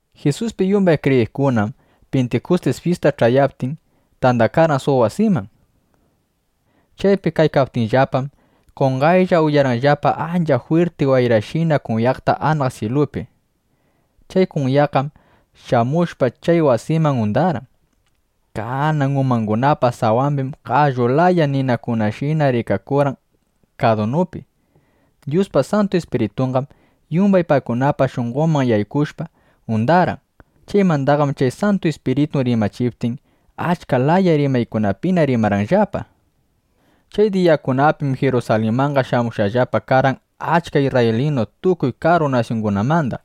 Jisuspi yumbay kriyiqkunam Pintikustis fyista ch'ayaptin, tandakarqan suq wasiman. Chaypi kaykaptinllapam, qonqaylla uyarqanllapa ancha jwirti wayrashina kunyaqta anaq syilupi. Chay kunyaqqam shamushpa, chay wasiman undarqan. Kanan umangunapa sawambim qallu laya ninakunashina rikakurqan kadunupi. Dyuspa Santu Ispiritunqam yumbay paykunapa shunqonman yaykushpa, undarqan. Chaymandaqam chay Santu Ispiritu rimachiptin, achka laya rimaykunapina rimarqanllapa. Chay diyakunapim Jirusalinmanqa shamushqallapa karqan achka isrraylinukuna tukuy karu nasyungunamanda.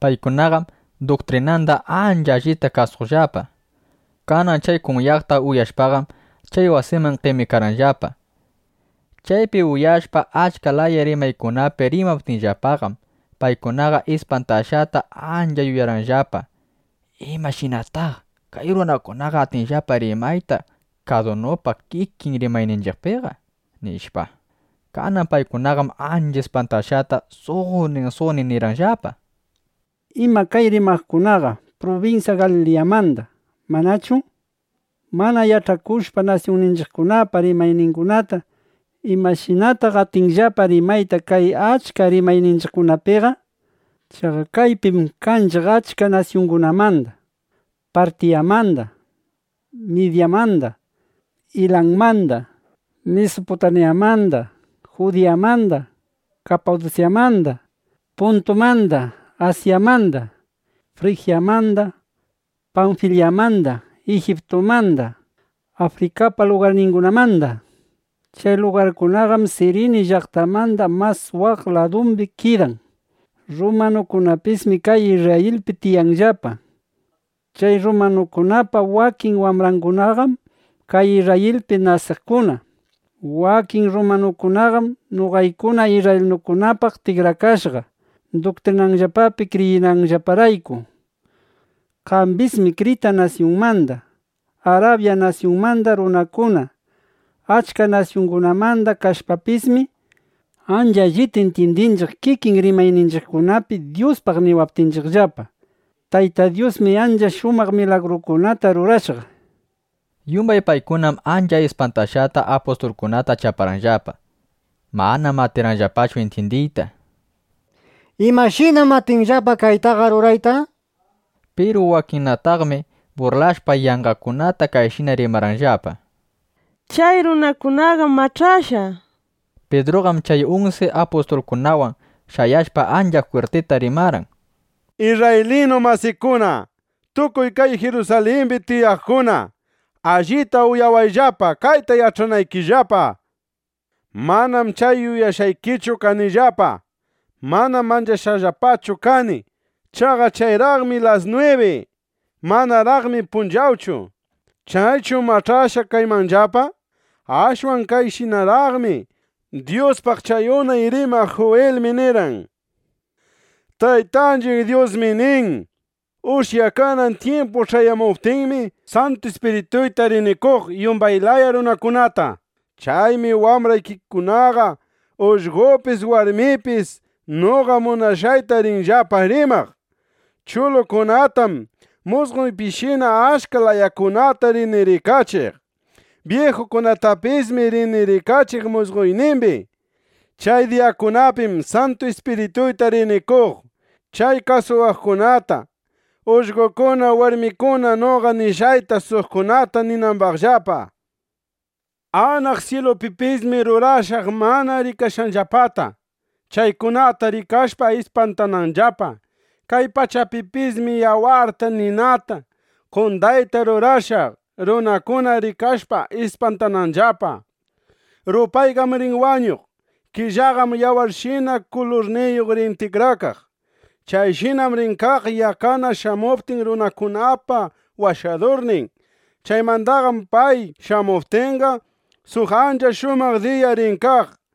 Paykunaqam duktrinanda ancha allita kasuqllapa. Kanan chay kunyaqta uyashpaqam, chay wasiman qemikarqanllapa. Chaypi uyashpa achka laya rimaykunapi rimaptinllapaqam, paykunaqa ispantashqata ancha yuyarqanllapa: ¿Imashinataq kay runakunaqa atinllapa rimayta kadunupa kikin rimayninchiqpiqa? nishpa. Kanan paykunaqam ancha ispantashqata suqnin suqnin nirqanllapa: —Ima kay rimaqkunaqam prubinsya Galiliyamanda ¿manachu? Mana yach'akushpa nasyunninchiqkunapa rimayningunata, ¿imashinataq atinllapa rimayta kay achka rimayninchiqkunapiqa? Chaqa kaypim kanchiq achka nasyungunamanda: Partiyamanda, Midyamanda, Ilanmanda, Misuputamyamanda, Judiyamanda, Kapadusyamanda, Puntumanda, Asyamanda, Frijyamanda, Panfilyamanda, Ijiptumanda, Afrikapa lugarningunamanda. Chay lugarkunaqam Sirini llaqtamanda mas waq ladumbi kidan. Rrumanukunapismi kay Isrrayilpi tiyanllapa. Chay rrumanukunapa wakin wambrangunaqam kay Isrrayilpi nasiqkuna. Wakin rrumanukunaqam noqaykuna isrraylinukunapaq tikrakashqa, duktrinayllapapi kriyishqanllaparayku. Kambismi Krita nasyunmanda, Arabya nasyunmanda runakuna. Achka nasyungunamanda kashpapismi, ancha allita intyindinchiq kikin rimayninchiqkunapi Dyuspaq niwaptinchiqllapa: Tayta Dyusmi ancha shumaq milagrukunata rurashqa, nishpa. Yumbay paykunam ancha ispantashqata apustulkunata chaparqanllapa. Manam atirqanllapachu intyindiyta: —¿Imashinam atinllapa kaytaqa rurayta? nishpa. Piru wakinnataqmi burlashpa, yanqakunata kayshina rimarqanllapa: —Chay runakunaqam mach'ashqa, nishpa. Pidruqam chay unsi apustulkunawan shayashpa ancha jwirtita rimarqan: —Isrraylinu masikuna, tukuy kay Jirusalimbi tiyaqkuna, allita uyawayllapa, kayta yach'anaykillapa. Manam chay yuyashqaykichu kanillapa. Manam mach'ashqallapachu kani. Chaqa chayraqmi las nwibi. Manaraqmi punchawchu. ¿Chaychu mach'ashqa kaymanllapa? Ashwan kayshinaraqmi. Dyuspaq chay unay rimaq Juwilmi nirqan: Taytanchiq Dyusmi nin: Ushyakanan tyimpu ch'ayamuptinmi, Santu Ispirituyta rini qoq yumbay laya runakunata. Chaymi wambraykikunaqa, ullqopis, warmipis noqa munashqayta rinllapa rimaq. Chulukunatam musqoypishina achka layakunata rini rikachiq. Byijukunatapismi rini rikachiq musqoynimbi. Chay diyakunapim Santu Ispirituyta rini qoq chay kasuwaqkunata, ullqokuna warmikuna noqa nishqayta suqkunata ninambaqllapa. Anaq syilupipismi rurashaq mana rikashqanllapata, chaykunata rikashpa, ispantananllapa. Kay pachapipismi yawarta, ninata, qondayta rurashaq, runakuna rikashpa ispantananllapa. Rupayqam rin wañuq. Killaqam yawarshina kulurniyuq rin tikrakaq. Chayshinam rin kaq yaqqana shamuptin runakunapa Washadurnin. Chaymandaqam pay shamuptinqa, suq ancha shumaq diya rin kaq.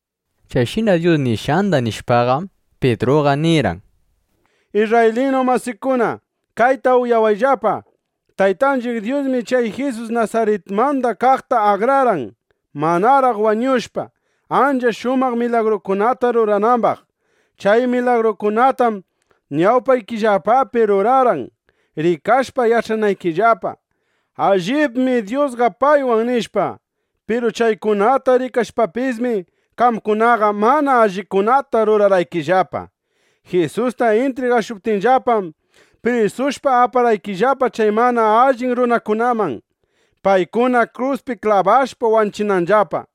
Chayshina Dyus nishqanda nishpaqam, Pidruqa nirqan: —Isrraylinu masiykuna, kayta uyawayllapa: Taytanchiq Dyusmi chay Jisus Nasaritmanda kaqta akrarqan, manaraq wañushpa, ancha shumaq milagrukunata ruranambaq. Chay milagrukunatam ñawpaykillapapi rurarqan, rikashpa yach'anaykillapa: Allibmi Dyusqa paywan, nishpa. Piru chaykunata rikashpapismi, qamkunaqa mana allikunata rurarqaykillapa. Jisusta intrigashuptinllapam, prisushpa aparqaykillapa chay mana allin runakunaman, paykuna kruspi klabashpa wanchinanllapa.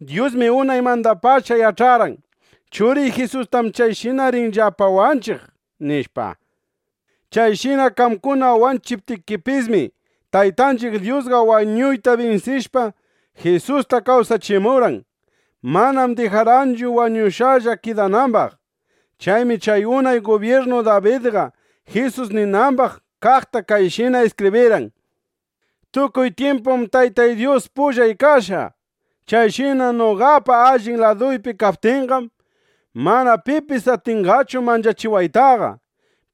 Dyusmi unaymandapacha yach'arqan: Churiy Jisustam chayshina rinllapa wanchiq, nishpa. Chayshina qamkuna wanchiptikipismi, Taytanchiq Dyusqa wañuyta binsishpa, Jisusta kawsachimurqan. Manam dijarqanchu wañushqalla kidanambaq. Chaymi chay unay gubyirnu Dabidqa Jisus ninambaq kaqta kayshina iskibrirqan: Tukuy tyimpum Taytay Dyus pullay kashqa. Chayshina noqapa allin laduypi kaptinqam, mana pipis atinqachu manchachiwaytaqa.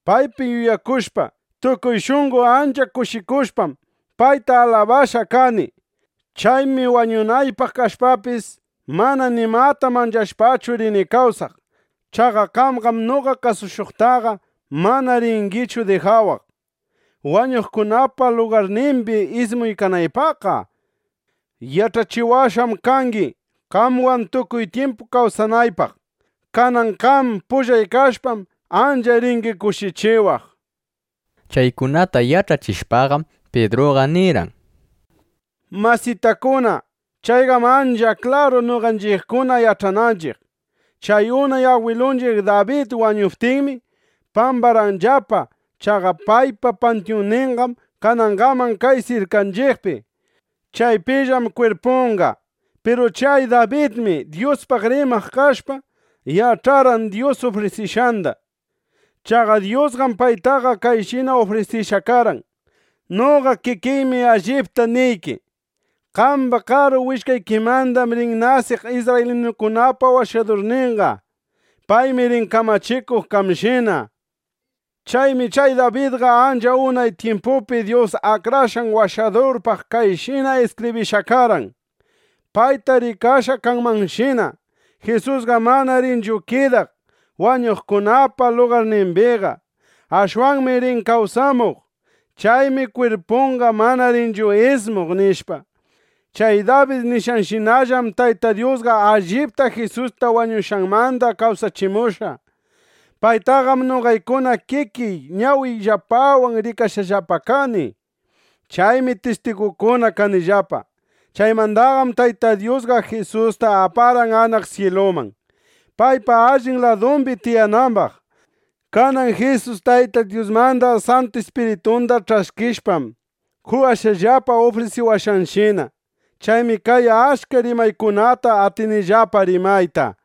Paypi yuyakushpa, tukuy shunqo ancha kushikushpam, payta alabashqa kani. Chaymi wañunaypaq kashpapis, mana nimata manchashpachu rini kawsaq. Chaqa qamqam noqa kasushuqtaqa mana ringichu dijawaq, wañuqkunapa lugarnimbi ismunaypaqqa. Yach'achiwashqam kangi, qamwan tukuy tyimpu kawsanaypaq. Kanan qam pullay kashpam, ancha ringi kushichiwaq. Chaykunata yach'achishpaqam, Pidruqa nirqan: —Masitakuna, chayqam ancha klaru, noqanchiqkuna yach'ananchiq. Chay unay agwilunchiq Dabid wañuptinmi, pambarqanllapa. Chaqa paypa pantyunninqam kanangaman kay sirkanchiqpi. Chaypillam kwirpunqa. Piru chay Dabidmi Dyuspaq rimaq kashpa, yach'arqan Dyus ufrisishqanda. Chaqa Dyusqam paytaqa kayshina ufrisishqa karqan: “Noqa kikiymi allipta niyki: Qamba karu willkaykimandam rin nasiq isrraylinukunapa Washadurninqa. Paymi rin kamachikuq qamshina”, nishpa. Chaymi chay Dabidqa ancha unay tyimpupi Dyus Akrashqan Washadurpaq kayshina iskibrishqa karqan, payta rikashqa kanmanshina: Jisusqam mana rinchu kidaq wañuqkunapa lugarnimbiqa. Ashwanmi rin kawsamuq. Chaymi kwirpunqa mana rinchu ismuq, nishpa. Chay Dabid nishqanshinallam Tayta Dyusqa allipta Jisusta wañushqanmanda kawsachimushqa. Paytaqam noqaykuna kikiy ñawiyllapawan rikashqallapa kani. Chaymi tistigukuna kanillapa. Chaymandaqam Tayta Dyusqa Jisusta aparqan anaq syiluman, paypa allin ladumbi tiyanambaq. Kanan Jisus Tayta Dyusmanda Santu Ispiritunda ch'askishpam, qowashqallapa ufrisiwashqanshina. Chaymi kay achka rimaykunata atinillapa rimayta.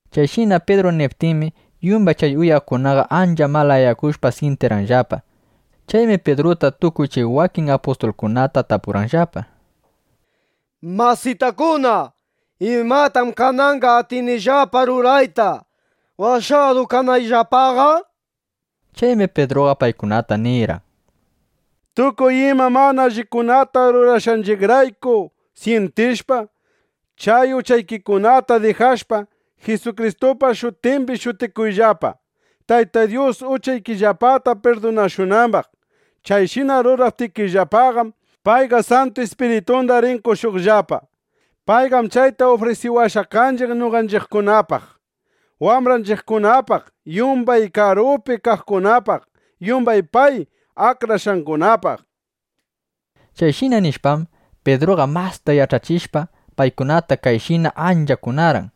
Chayshina Pidru niptinmi, yumbay chay uyaqkunaqa ancha malayakushpa syintirqanllapa. Chaymi Pidruta tukuy chay wakin apustulkunata tapurqanllapa: —¡Masitakuna! ¿Imatam kananqa atinillapa rurayta, washadu kanayllapaqa? nishpa. Chaymi Pidruqa paykunata nirqan: —Tukuy ima mana allikunata rurashqaykirayku syintishpa, chay uchaykikunata dijashpa, Jisukristupa shutimbi shutikuyllapa, Tayta Dyus uchaykillapata pirdunashunambaq. Chayshina ruraptikillapaqam, payqa Santu Ispiritunda rin qoshuqllapa. Payqam chayta ufrisiwashqa kanchiq noqanchiqkunapaq, wambranchiqkunapaq, yumbay karupi kaqkunapaq, yumbay pay akrashqangunapaq. Chayshina nishpam, Pidruqa masta yach'achishpa, paykunata kayshina ancha kunarqan: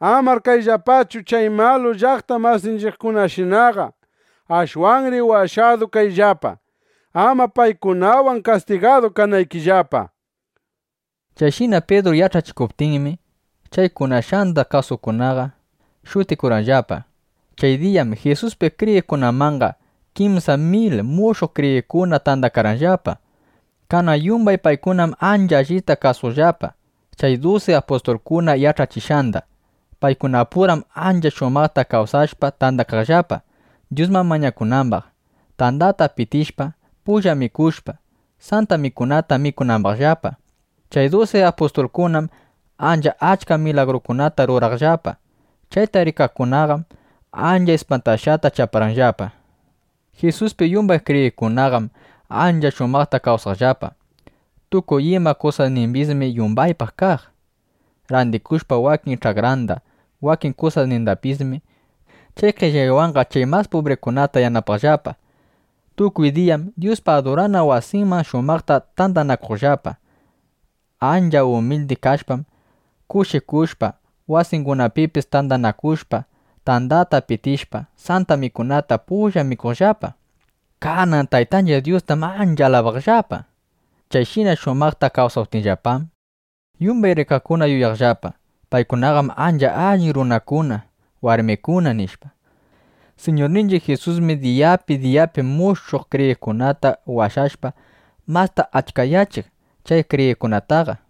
—Amar kayllapachu chay malu llaqta masinchiqkunashinaqa. Ashwanri washadu kayllapa, ama paykunawan kastigadu kanaykillapa. Chayshina Pidru yach'achikuptinmi, chay kunashqanda kasuqkunaqa shutikurqanllapa. Chay diyaqam Jisuspi kriyiqkunamanqa kimsa mil mushuq kriyiqkuna tandakarqanllapa. Kanan yumbay paykunam ancha allita kasuqllapa chay dusi apustulkuna yach'achishqanda. Paykunapuram ancha shumaqta kawsashpa tandakaqllapa, Dyusman mañakunambaq, tandata pitishpa, pulla mikushpa, Santa Mikunata mikunambaqllapa. Chay dusi apustulkunam ancha achka milagrukunata ruraqllapa. Chayta rikaqkunaqam ancha ispantashqata chaparqanllapa. Jisuspi yumbay kriyiqkunaqam ancha shumaqta kawsaqllapa. Tukuy ima kusasnimbismi yumbaypaq kaq. Randikushpa wakin ch'akranda, wakin kusasnindapismi, chay qellaywanqa chay mas pubrikunata yanapaqllapa. Tukuy diyam Dyuspa adurana wasinman shumaqta tandanakuqllapa. Ancha umildi kashpam, kushikushpa, wasingunapipis tandanakushpa, tandata pitishpa, Santa Mikunata pulla mikuqllapa. Kanan Taytanchiq Dyustam ancha alabaqllapa. Chayshina shumaqta kawsaptinllapam, yumbay rikaqkuna yuyaqllapa: Paykunaqam ancha allin runakuna, warmikuna, nishpa. Siñurninchiq Jisusmi diyapi diyapi mushuq kriyiqkunata washashpa, masta achkayachiq chay kriyiqkunataqa.